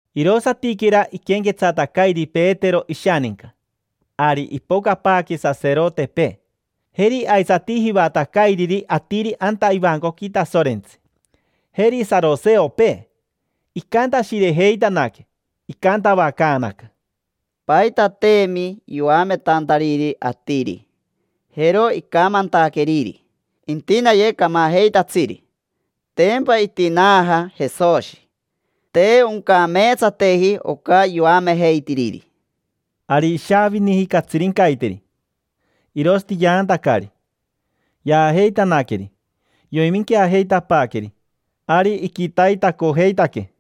Irosatiquera iquenquetsatacairi Petero ishaninca, ari ipocapaaque saserotepee. Jeri aisati jivatacairiri atiri anta ivancoqui Tasorentsi. Jeri saroseopee. Icantashirejeitanaque, icantavacaanaca: —Paitateemi yoametantariri atiri. Jero icamantaqueriri: “Intinaye camajeitatsiri: tempa itinaaja Jesoshi”. Te oncameetsateji oca yoamejeitiriri. Ari ishaaviniji catsirincaiteri, irosati yaantacari, tapi. Yaajeitanaqueri, yoiminqueajeitapaaqueri, ari iquitaitacojeitaque.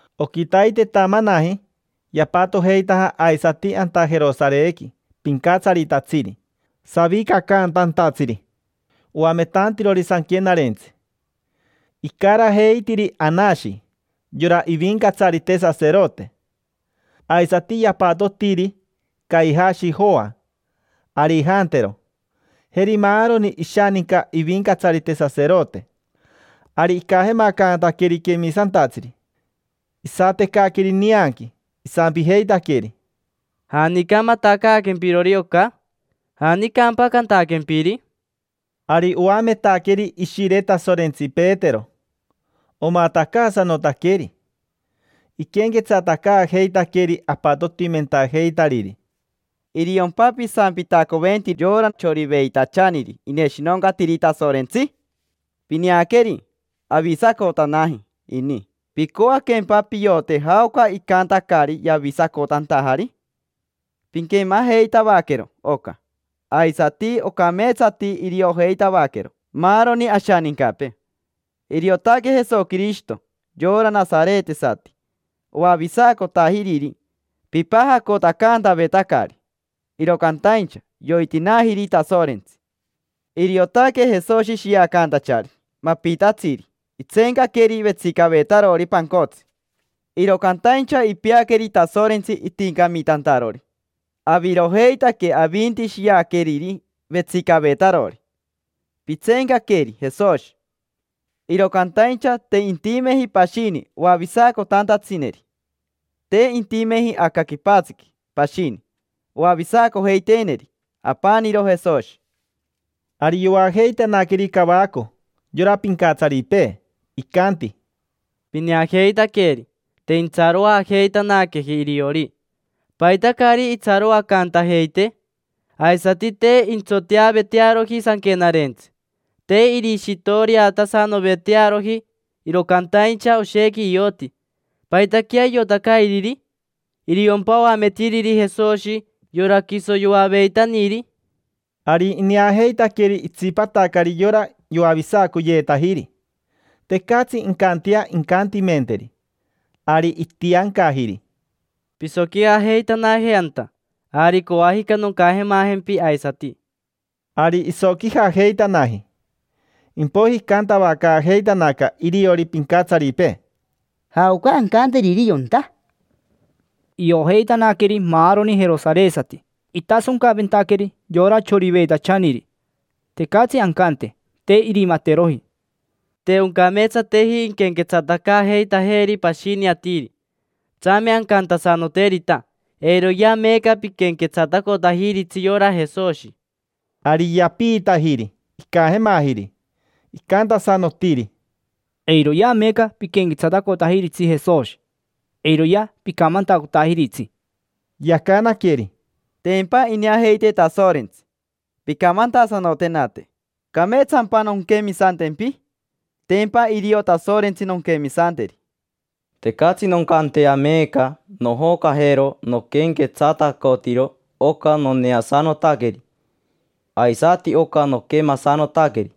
Oquitaitetamanaji yapatojeitaja aisati anta Jerosarequi pincatsaritatsiri, savicacantantatsiri, oametantirori sanquenarentsi. Icarajeitiri Anashi, yora ivincatsarite saserote. Aisati yapatotiri Caijashi, Joa, Arijantero, jeri maaroni ishaninca ivincatsarite saserote. Ari icajemacantaqueri quemisantatsiri, isatecaqueri nianqui, isampijeitaqueri: —¿Janica matacaaquempirori oca? ¿Janicampa cantaquempiri? Ari oametaqueri Ishire Tasorentsi Petero, omatacaasanotaqueri. Iquenquetsatacaajeitaqueri apatotimentajeitariri: —¿Iriompa pisampitacoventiri yora choriveitachaniri ineshinoncatiri Tasorentsi? Pineaqueri, avisacotanaji ini. ¿Picoaquempa piote jaoca icantacari yavisacotantajari? Pinquemajeitavaquero oca. Aisati ocameetsati iriojeitavaquero maaroni ashanincapee. Iriotaque Jesoquirishito, yora nasaretesati, oavisacotajiriri. Pipajacotacantavetacari, iro cantaincha yoitinaajiri Tasorentsi. Iriotaque Jesoshi shiacantachari mapitatsiri itseencaqueri vetsicavetarori pancotsi: iro cantaincha ipeaqueri Tasorentsi itincamitantarori. Avirojeitaque avinti shiaqueriri vetsicavetarori: pitseencaqueri Jesoshi. Iro cantaincha te intimeji pashini oavisacotantatsineri: te intimeji aca quipatsiqui pashini oavisacojeiteeneri: apaniro Jesoshi. Ari yoajeitanaqueri cavaco yora pincatsaripee, icanti: —Pineajeitaqueri, te intsaroajeitanaqueji iriori. ¿Paita caari itsaroacantajeitee? Aisati te intsoteavetearoji sanquenarentsi, te irishitoriotasanovetearoji, iro cantaincha oshequi ioti. ¿Paitaquea iotacairiri? ¿Iriompa oametiriri Jesoshi, yora quiso yoaveitaniri? Ari ineajeitaqueri itsipatacari yora yoavisacoyeetajiri. Tecatsi incantea incantimenteri. Ari itiancajiri: —Pisoquijajeitanaje anta; ari coajica noncajemajempi aisati. Ari isoquijajeitanaji. Impoiji icantavacaajeitanaca iriori pincatsaripee: —¿Jaoca ancanteriri yonta? Iojeitanaqueri maaroni jerosaresati itasoncaventaqueri yora choriveitachaniri. Tecatsi ancante: “Te irimateroji”. Te oncameetsateji inquenquetsatacaajeitajeri pashini atiri. Tsame ancantasanoterita: “Eiroyea meeca piquenquetsatacotajiritsi yora Jesoshi”. Ari yapiitajiri, icajemajiri. Icantasanotiri: —Eiroyea meeca piquenquetsatacotajiritsi Jesoshi. Eiroyea picamantacotajiritsi. Yacanaqueri: —Tempa ineajeitee Tasorentsi. Pincamantasanotenate: ¿cameetsampa nonquemisantempi? Tempa irio Tasorentsi nonquemisanteri. Tecatsi noncantea meeca nojocajero noquenquetsatacotiro oca noneasanotaqueri, aisati oca noquemasanotaqueri.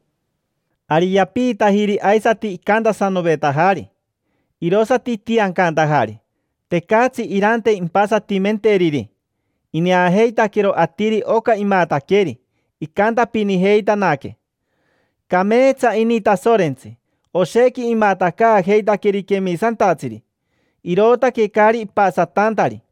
Ari yapiitajiri aisati icantasanovetajari, irosati itiancantajari. Tecatsi irante impasatimenteriri. Ineajeitaquero atiri oca imataqueri, icantapinijeitanaque: “Cameetsa ini Tasorentsi, oshequi imatacaajeitaqueri quemisantatsiri”, irootaque caari ipasatantari.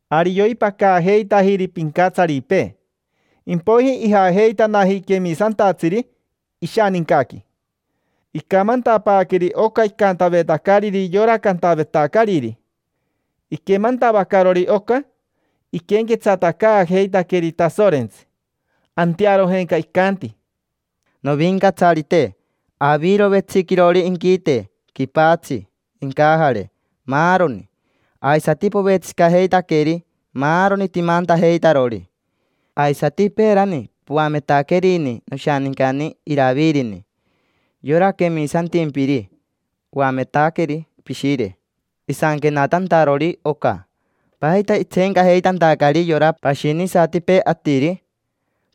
Ari yoimpacaajeitajiri pincatsaripee, impoiji ijajeitanaji quemisantatsiri ishanincaqui. Icamantapaaqueri oca icantavetacariri yora cantavetacariri. Iquemantavacarori oca, iquenquetsatacaajeitaqueri Tasorentsi. Antearojenca icanti: —Novincatsarite. Aviro vetsiquirori inquite, quipatsi, incajare, maaroni; aisati povetsicajeitaqueri maaroni timantajeitarori. Aisati peerani poametaquerini noshanincani Iravirini, yora quemisantimpiri. Oametaqueri pishire, isanquenatantarori oca: “¿Paita itseencajeitantacari yora pashinisatipee atiri?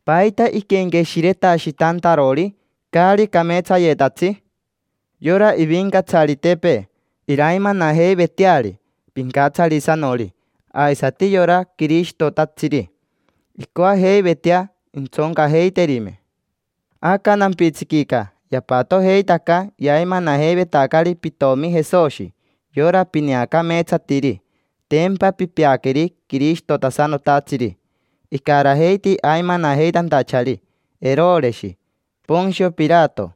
¿Paita iquenqueshiretashitantarori caari cameetsayetatsi? Yora ivincatsaritepee iraimanajeiveteari Pincatsarisanori, aisati yora Quirishitotatsiri; incoajeivetea intsoncajeiterime”. Aca nampitsiquica yapatojeitaca yaimanajeivetacari pitomi Jesoshi, yora pineacameetsatiri. Tempa pipeaqueri Quirishitotasanotatsiri. Icarajeiti aimanajeitantachari Eroreshi, Pontsio Pirato,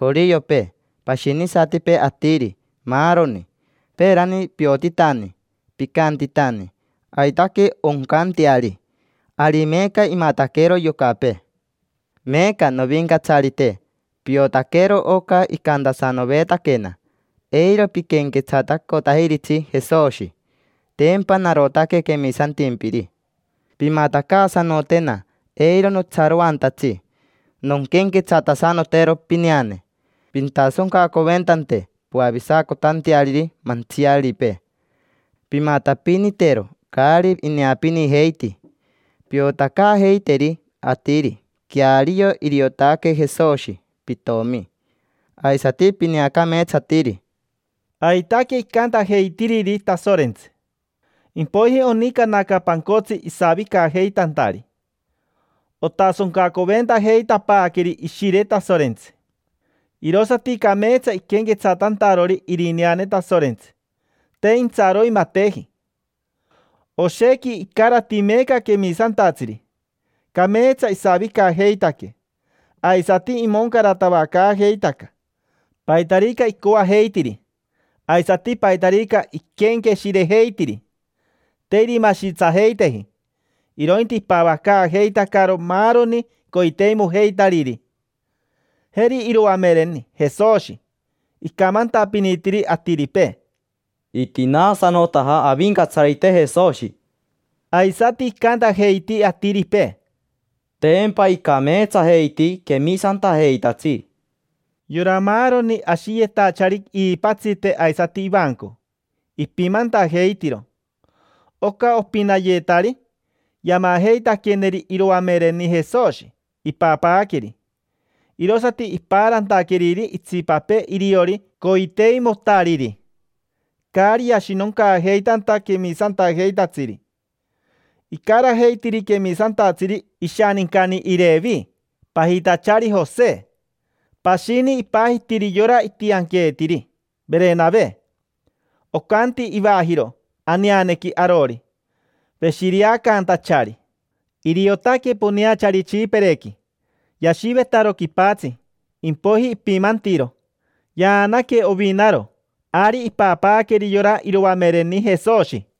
joriopee, pashinisatipee atiri, maaroni. Peerani piotitani, picantitani: “Aitaque oncanteari”. Ari meeca imataquero yocapee. Meeca, Novincatsarite, piotaquero oca icantasanovetaquena: “Eiro piquenquetsatacotajiritsi Jesoshi”. Tempa narotaque quemisantimpiri. Pimatacaasanotena eiro notsaroantatsi nonquenquetsatasanotero pineane. Pintasoncacoventante, poavisacotanteariri mantsiaripee; pimatapinitero caari ineapinijeiti, piotacaajeiteri atiri queario iriotaque Jesoshi pitomi, aisati pineacameetsatiri. Aitaque icantajeitiriri Tasorentsi. Impoiji onicanaca pancotsi isavicajeitantari. Otasoncacoventajeitapaaqueri Ishire Tasorentsi, irosati cameetsa iquenquetsatantarori irineane Tasorentsi, te intsaroimateji. Oshequi icarati meeca quemisantatsiri, cameetsa isavicajeitaque, aisati imoncaratavacaajeitaca: paitarica icoajeitiri aisati paitarica iquenqueshirejeitiri. Te irimashitsajeiteji, irointi ipavacaajeitacaro maaroni coiteimojeitariri. Jeri iroamereni Jesoshi, icamantapinitiri atiripee: —Itinaasanotaja Avincatsarite Jesoshi. Aisati icantajeiti atiripee: —Tempa icameetsajeiti quemisantajeitatsiri. Yora maaroni ashiyetachari iipatsite aisati ivanco, ipimantajeitiro. Oca opinayetari, yamajeitaqueneri iroamereni Jesoshi, ipapaaqueri. Irosati ipaarantaqueriri itsipapee iriori coiteimotariri, caari yashinoncaajeitanta quemisantajeitatsiri. Icarajeitiri quemisantatsiri ishanincani Irevi, pajitachari Jose. Pashini ipajitiri yora itianqueetiri: Verenave. Ocanti ivajiro aneanequi arori: “Veshireacaantachari”. Iriotaque poneachari Tsipirequi. Yashivetaro quipatsi, impoiji ipimantiro. Yaanaque ovinaro, ari ipapaaqueri yora iroamereni Jesoshi.